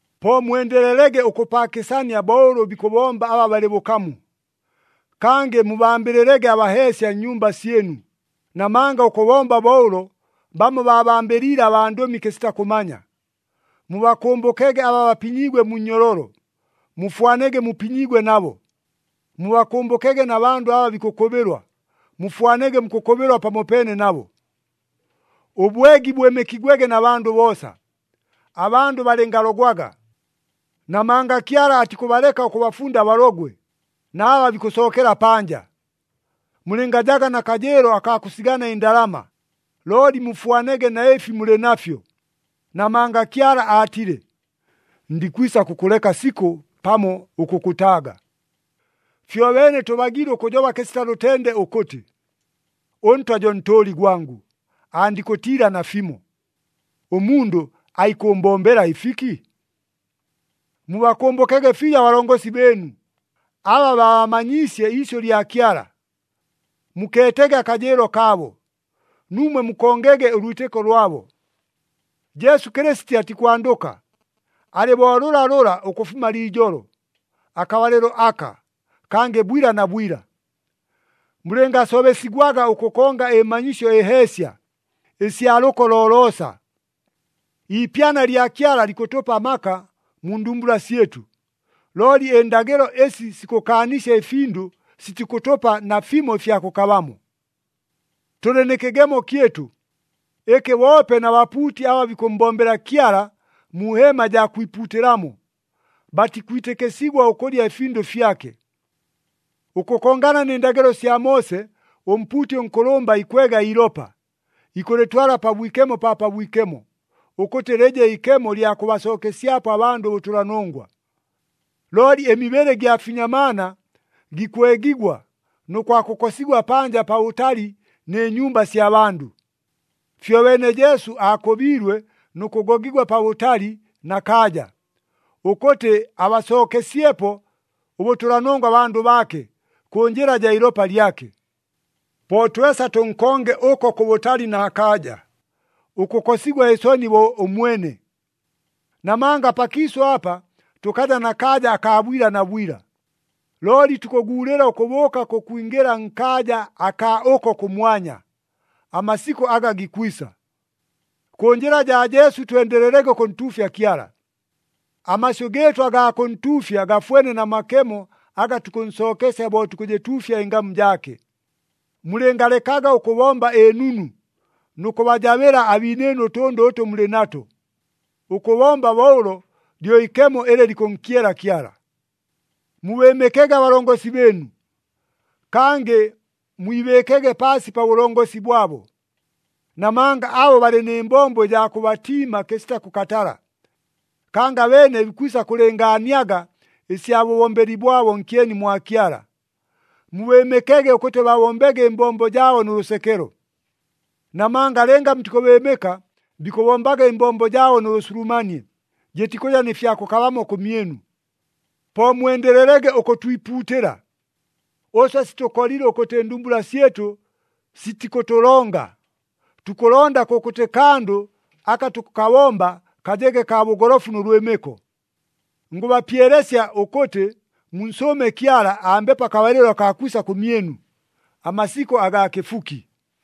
Po mwendelelege ʉkʉpaakɨsania bo ʉlʉ bikʉbomba aba balɨ bʉkamu. Kangɨ mubambɨlɨlege abaheesya nnyumba syɨnu, namanga ʉkʉbomba bo ʉlo, bamo baabambɨliile abandʉmi kɨsita kʉmanya. Mubakʉmbʉkege aba bapinyiigwe mu nnyololo, mufwanege mupinyiigwe nabo. Mubakʉmbʉkege na bandʉ aba bikʉkʉbɨlwa, mufwanege mukʉkʉbɨlwa pamopeene nabo. Ʉbwegi bwɨmɨkigwege na bandʉ boosa, abandʉ balɨngalogwaga. Namanga Kyala atikʉbaleka ʉkʉbafunda abalogwe na aba bikʉsookela panja. Mulɨngajaga na kajɨɨlo akaa kʉsigana ɨndalama, looli mufwanege na ɨfi mulɨ nafyo. Namanga Kyala aatile, “Ndikwisa kʉkʉleka sikʉ pamo ʉkʉkʉtaaga.” Fyobeene tʉbagiile ʉkʉjoba kɨsita lʉtende ʉkʉtɨ, “ɄNtwa jo ntʉʉli gwangʉ, andikʉtiila nafimo. Ʉmundʉ aikʉʉmbombela ɨfiki?” Mubakʉmbʉkege fiijo abalongosi bɨɨnu, aba baabamanyiisye iisyʉ lya Kyala. Mukeetege akajɨɨlo kaabo, nuumwe mukongege ʉlwitɨko lwabo. Jesu Kɨlɨsiti atikwandʉka, alɨ bo lʉlalʉla ʉkʉfuma liijolo, akabalɨlo aka, kangɨ bwila na bwila. Mulɨngasobesigwaga ʉkʉkonga ɨmanyisyo ɨheesya, ɨsya lʉko loloosa. Iipyana lya Kyala likʉtʉpa amaka mu ndumbula syɨtʉ, looli ɨndagɨlo ɨsi sikʉkaanisya ɨfindʉ sitikʉtʉpa nafimo ɨfya kʉkabamo. Tʉlɨ nɨ kɨgemo kyɨtʉ, ɨkɨ boope na bapuuti aba bikʉmmbombela Kyala mu heema jaa kwipuutɨlamo, batikwitɨkɨsigwa ʉkʉlya ɨfindʉ fyake. Ʉkʉkongana nɨ ndagɨlo sya Moose, ʉmpuuti ʉnkʉlʉmba ikwega iilopa, ikʉlɨtwala Pabwikemo pa Pabwikemo, ʉkʉtɨ lɨje ikemo ɨlya kʉbasookesyapo abandʉ ʉbʉtʉlanongwa. Looli ɨmibɨlɨ gya finyamaana gikwegigwa nʉ kwakʉkosigwa panja pabʉtali nɨ nyumba sya bandʉ. Fyobeene Jesu aakʉbiilwe nʉ kʉgogigwa pabʉtali na kaaja, ʉkʉtɨ abasookesyepo ʉbʉtʉlanongwa abandʉ baake, kʉ njɨla jaa ilopa lyake. Po twesa tʉnkonge ʉko kʉbʉtali na kaaja, ʉkʉkosigwa ɨsoni bo ʉmwene. Namanga pakiisʉ apa tʉkaja na kaaja akaa bwila na bwila, looli tukʉguulɨla ʉkʉbʉʉka kʉkwingɨla nkaaja akaa ʉko kʉmwanya, amasikʉ aga gikwisa. Kʉ njɨla jaa Jesu twendelelege ʉkʉntuufya Kyala. Amasyʉ gɨɨtʉ agaa kʉntuufya gafwene na makemo aga tukʉnsookesya bo tukʉjɨtuufya ɨngamu jaake. Mulɨngalekaga ʉkʉbomba ɨnunu nʉ kʉbajabɨla abiinɨɨnu ʉtʉndʉ ʉtʉ mulɨ nato. Ʉkʉbomba bo ʉlo lyo iikemo ɨlɨ likʉnkyela Kyala. Mubɨɨmɨkege abalongosi bɨɨnu, kangɨ mwibɨɨkege paasi pa bʉlongosi bwabo. Namanga abo balɨ nɨ mbombo ɨjaa kʉbatiima kɨsita kʉkatala. Kangɨ abeene bikwisa kʉlɨngaaniaga ɨsya bʉbombeli bwabo nkyeni mwa Kyala. Mubɨɨmɨkege ʉkʉtɨ babombege ɨmbombo jaabo nʉ lʉsekelo. Namanga lɨnga mutikʉbɨɨmɨka, bikʉbombaga ɨmbombo jaabo nʉ bʉsulumanie, jɨtikʉja nɨ fya kʉkabamo kʉmyɨnu. Po mwendelelege ʉkʉtwipuutɨla. Ʉswe sitʉkolile ʉkʉtɨ ɨndumbula syɨtʉ sitikʉtʉlonga, tukʉlonda kʉkʉtɨ kandʉ aka tukʉkabomba kajege kaa bʉgolofu nʉ lwɨmɨko. Ngʉbapyelesya ʉkʉtɨ, munsʉʉme Kyala ambepo akabalɨlo akaa kwisa kʉmyɨnu, amasikʉ agaa kɨfuki.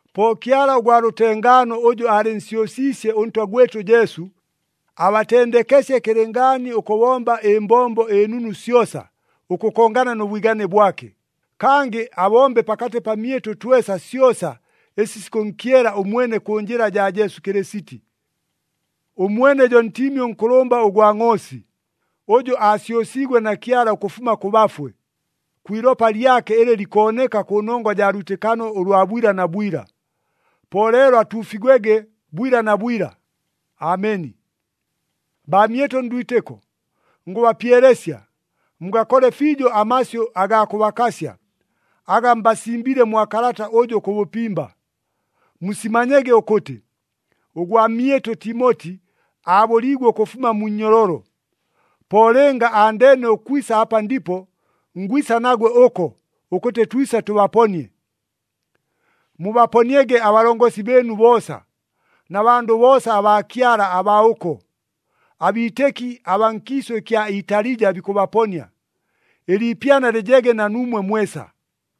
Po Kyala ʉgwa lʉtengaano ʉjʉ aalɨnsyʉsiisye ʉNtwa gwɨtʉ Jesu, abatendekesye kɨlɨngaani ʉkʉbomba ɨmbombo ɨnunu syosa ʉkʉkongana nʉ bwigane bwake, kangɨ abombe pakatɨ pamyɨtʉ twesa syosa ɨsi sikʉnkyela ʉmwene kʉ njɨla jaa Jesu Kɨlɨsiti. Ʉmwene jo Ntiimi ʉNkʉlʉmba ʉgwa ngʼoosi, ʉjʉ aasyʉsiigwe na Kyala ʉkʉfuma kʉ bafwe, kwi ilopa lyake ɨlɨ likooneka kʉnongwa jaa lwitɨkano ʉlwa bwila na bwila. Po leelo atuufigwege bwila na bwila. Ameni. Baamyɨtʉ ndwitɨko, ngʉbapyelesya, mugakole fiijo amasyʉ agaa kʉbakasya, aga mbasimbiile mwa kalata ʉjʉ kʉ bʉpimba. Musimanyege ʉkʉtɨ, ʉgwamyɨtʉ Timoti aabʉliigwe ʉkʉfuma mu nnyololo. Po lɨnga andeene ʉkwisa apa ndipo, ngwisa nagwe ʉko, ʉkʉtɨ twise tʉbaponie. Mubaponiege abalongosi bɨɨnu boosa, na bandʉ boosa abaa Kyala abaa ʉko. Abiitɨki abaa nkiisʉ ɨkya Italija bikʉbaponia. Ɨliipyana lɨjege na nuumwe mwesa.